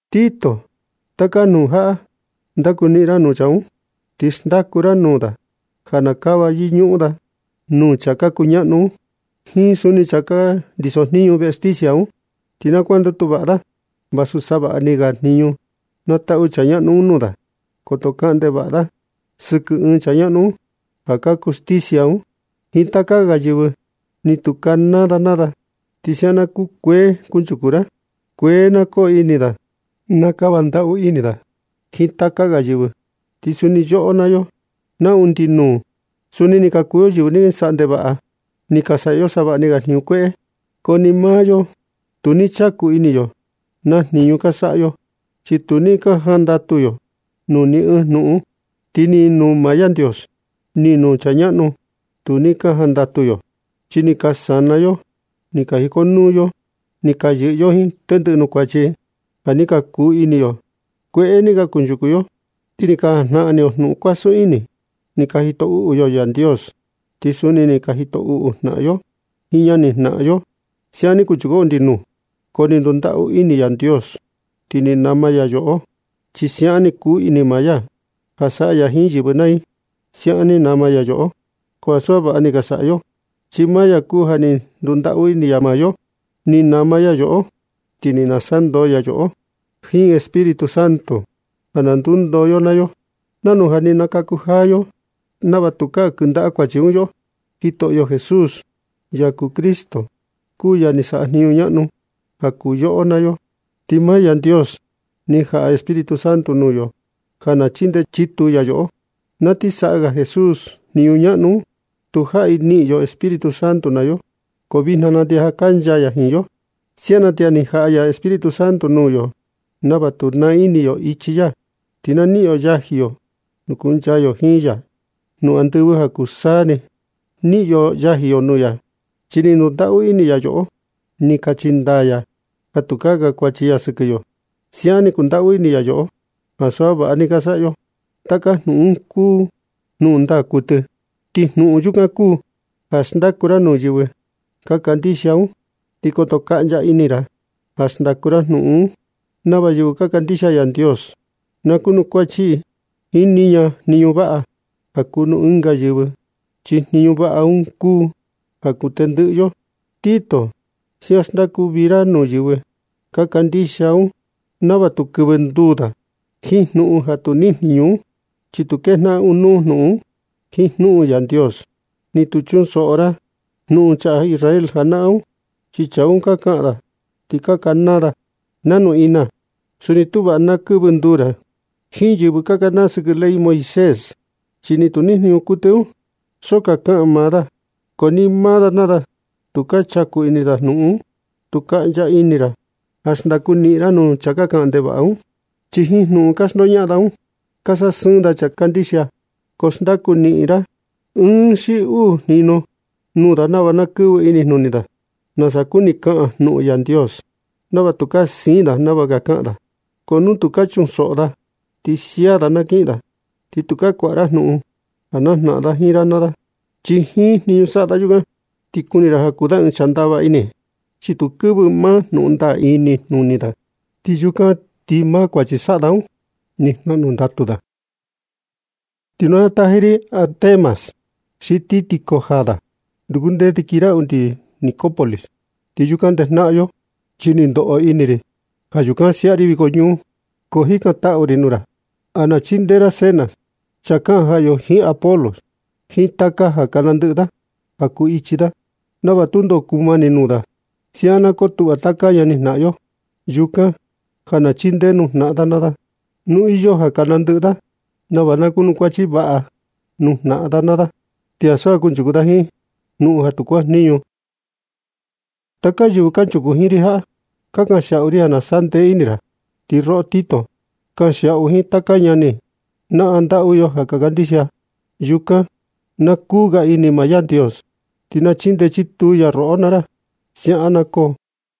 Tito, taka jnuꞌun jaꞌa ndakuniꞌin ra nuu chaa un, ti xndaku ra nuu da ja na kava yɨñuꞌun da nuu chaa ka kuñaꞌnu un jiin suni chaa ka ndiso jniñu veꞌe stisia un. Ti na kuandatu vaꞌa da vasu savaꞌni ga jniñu na taꞌu chaa ñaꞌnu un nuu da. Koto kaꞌan ndevaꞌa da sɨkɨ ɨɨn ɨɨn chaa ñaꞌnu ja ka kuu stisia un, jiin taka ga yɨvɨ, ni tu kanaa da naa da. Ti siaꞌan na kukuee kunchuku da. Kuee na koo ini da ti na kava ndaꞌu ini da jiin taka ga yɨvɨ. Chi suni yoꞌo naa yo na undi nuu suni ni ka kuu yo yɨvɨ ni ka saꞌa ndevaꞌa, ni ka saꞌa yo savaꞌni ga jniñu kueꞌe. Ko ni maa yo, tu ni chaku ini yo na jniñu ka saꞌa yo, chi tu ni ka jandatu yo nuu ni ɨɨn jnuꞌun, ti ni nuu maa Yandios, ni nuu chaa ñaꞌnu tu ni ka jandatu yo. Chi ni ka sana yo ni ka jikonuu yo, ti ni ka yɨꞌɨ yo jiin tendɨꞌɨ nuu kuachi ja ni ka kuu ini yo. Kueꞌe ni ka kunchuku yo, ti ni ka jajnaꞌan ini yo jnuꞌun kuasun ini. Ni ka jito uꞌu yo Yandios, ti suni ni ka jito uꞌu jnaꞌan yo jiin ñani jnaꞌan yo. Siaꞌan ni kunchuku yo undi nuu, ko ni ndundaꞌu ini Yandios ti ni nama ya yoꞌo, chi siaꞌan ni kuu ini maa ya ja saꞌa ya jiin yɨvɨ naa i. Siaꞌan ni nama ya yoꞌo, ko ansu ja vaꞌa ni ka saꞌa yo, chi maa ya kuu ja ni ndundaꞌu ini ya yoꞌo. Ni nama ya yoꞌo ti ni nasandoo ya maa yo jiin Espíritu Santo ja na ndundoo yo naa yo nanu ja ni ka nakaku jaa yo, nava tukaa kɨndaꞌa kuachi un yoꞌo. Jitoꞌo Jesús, ya kuu Cristo, kuu ya ni saꞌa ɨɨn jniñu ñaꞌnu ja kuu yoꞌo naa yo. Ti maa Yandios ni jaꞌa Espíritu Santo nuu yo ja na chindee chituu ya yoꞌo. Na ti saꞌa ga Jesús ɨɨn jniñu ñaꞌnu un, tujaꞌi niꞌin yo Espíritu Santo naa yo, ko vijna na ti ja kancha ya jiin yo. Siaꞌan na ti ja ni jaꞌa ya Espíritu Santo nuu yo nava tu naa ini yo ichi ya ti na niꞌin yo yaji yo, ti kuncha yo jiin ya nuu andɨvɨ ja kuu taka saa ni. Niꞌin yo yaji yo nuu ya chi ni ndundaꞌu ini ya yoꞌo. Ni kachi ndaa ya ja tukaa kankuachi ya sɨkɨ yo. Siaꞌan ni kundaꞌu ini ya yoꞌo ko ansu ja vaꞌa ni ka saꞌa yo. Taka jnuꞌun un kuu maa jnuꞌun ndaa kuɨtɨ. Ti jnuꞌun yukan kuu ja xndaku ra nuu yɨvɨ ka kandixia un. Ti koto kaꞌncha ini ra ja xndaku ra jnuꞌun un, nava yɨvɨ ka kandixia Yandios, na kuanukuachi i jiin niña jniñu vaꞌa ja kuu nuu ɨnga yɨvɨ, chi jnuꞌun vaꞌa un kuu ja kuu tendɨꞌɨ yo. Tito, siaꞌan xndaku vii ra nuu yɨvɨ ka kandixia un nava tu kɨvɨ nduu da jiin jnuꞌun ja tu nijniñu un, chi tu kejnaꞌan ɨɨn nuu jnuꞌun un jiin jnuꞌun Yandios. Ni tu chunsoꞌo ra jnuꞌun chaa Israel janaꞌan un, chi chaa un ka kaꞌan da ti ka kanaa da jnuꞌun ina. Suni tu vaꞌa nu na kɨvɨ nduu ra jiin yɨvɨ ka kanaa sɨkɨ ley Moisés, chi ni tu nijniñu kuɨtɨ un, so ka kaꞌan maa da. Ko ni maa da naa da tu ka chaku ini da na jnuꞌun kuu. Tu kaꞌncha ini ra ja xndaku niꞌin ra nuu chaa ka kaꞌan ndevaꞌa un, chi jiin jnuꞌun ka xndoñaꞌan da un ka sasɨɨn da chaa ka kandixia. Ko xndaku niꞌin ra ɨɨn xi uu jinu nuu da nava na kɨvɨ ini da nasa kuni kaꞌan jnuꞌun Yandios, nava tukaa siin da nava ka kaꞌan da. Ko nu tu ka chunsoꞌo da, ti sia da na kiꞌin da, ti tukaa kuaꞌa ra jnuꞌun ja najnaꞌan da jiin ra naa ra. Chi jiin jniñu saꞌa da yukan ni ti kuni ra ja kuu da ɨɨn chaa ndava ini, chi tu kɨvɨ maa jnuꞌun ndaa un inijnuni da. Yukan ti jiin maa kuachi saꞌa da un ni jnaꞌnu ndatu da. Nu na taji ri Artemas xi Tíquico jaa da, ndukundee ti kii ra undi Nicópolis ti yukan ndejnaꞌan yo, chi ni ndoꞌo ini ri ja yukan kin siaꞌa ri viko ñuu. Ko jikantaꞌu ri nuu ra ja na chindee ra Zenas, chaa kaꞌan jaꞌa yo yo jiin Apolos, jiin taka ja ka nandɨꞌɨ da ja kuu ichi da nava tundo kumani nuu da. Siaꞌan na kotuꞌva taka ñani jnaꞌan yo yukan, ja na chindee nuu jnaꞌan da naa da nu iyo ja ka nandɨꞌɨ da, nava na kunukuachi vaꞌa nuu jnaꞌan da naa da, ti ansu ja na kunchuku da jiin jnuꞌun ja tu kuajniñu. Taka yɨvɨ kanchuku jiin ri jaꞌa ka kanxiaꞌu i ja na sandee ini ra. Ti roꞌo Tito, kanxiaꞌu jiin taka ñani jnaꞌan ndaꞌu yo ja ka kandixia yukan. Na kuu ga ini maa Yandios, ti na chindee chituu ya roꞌo naa ra. Siaꞌan na koo.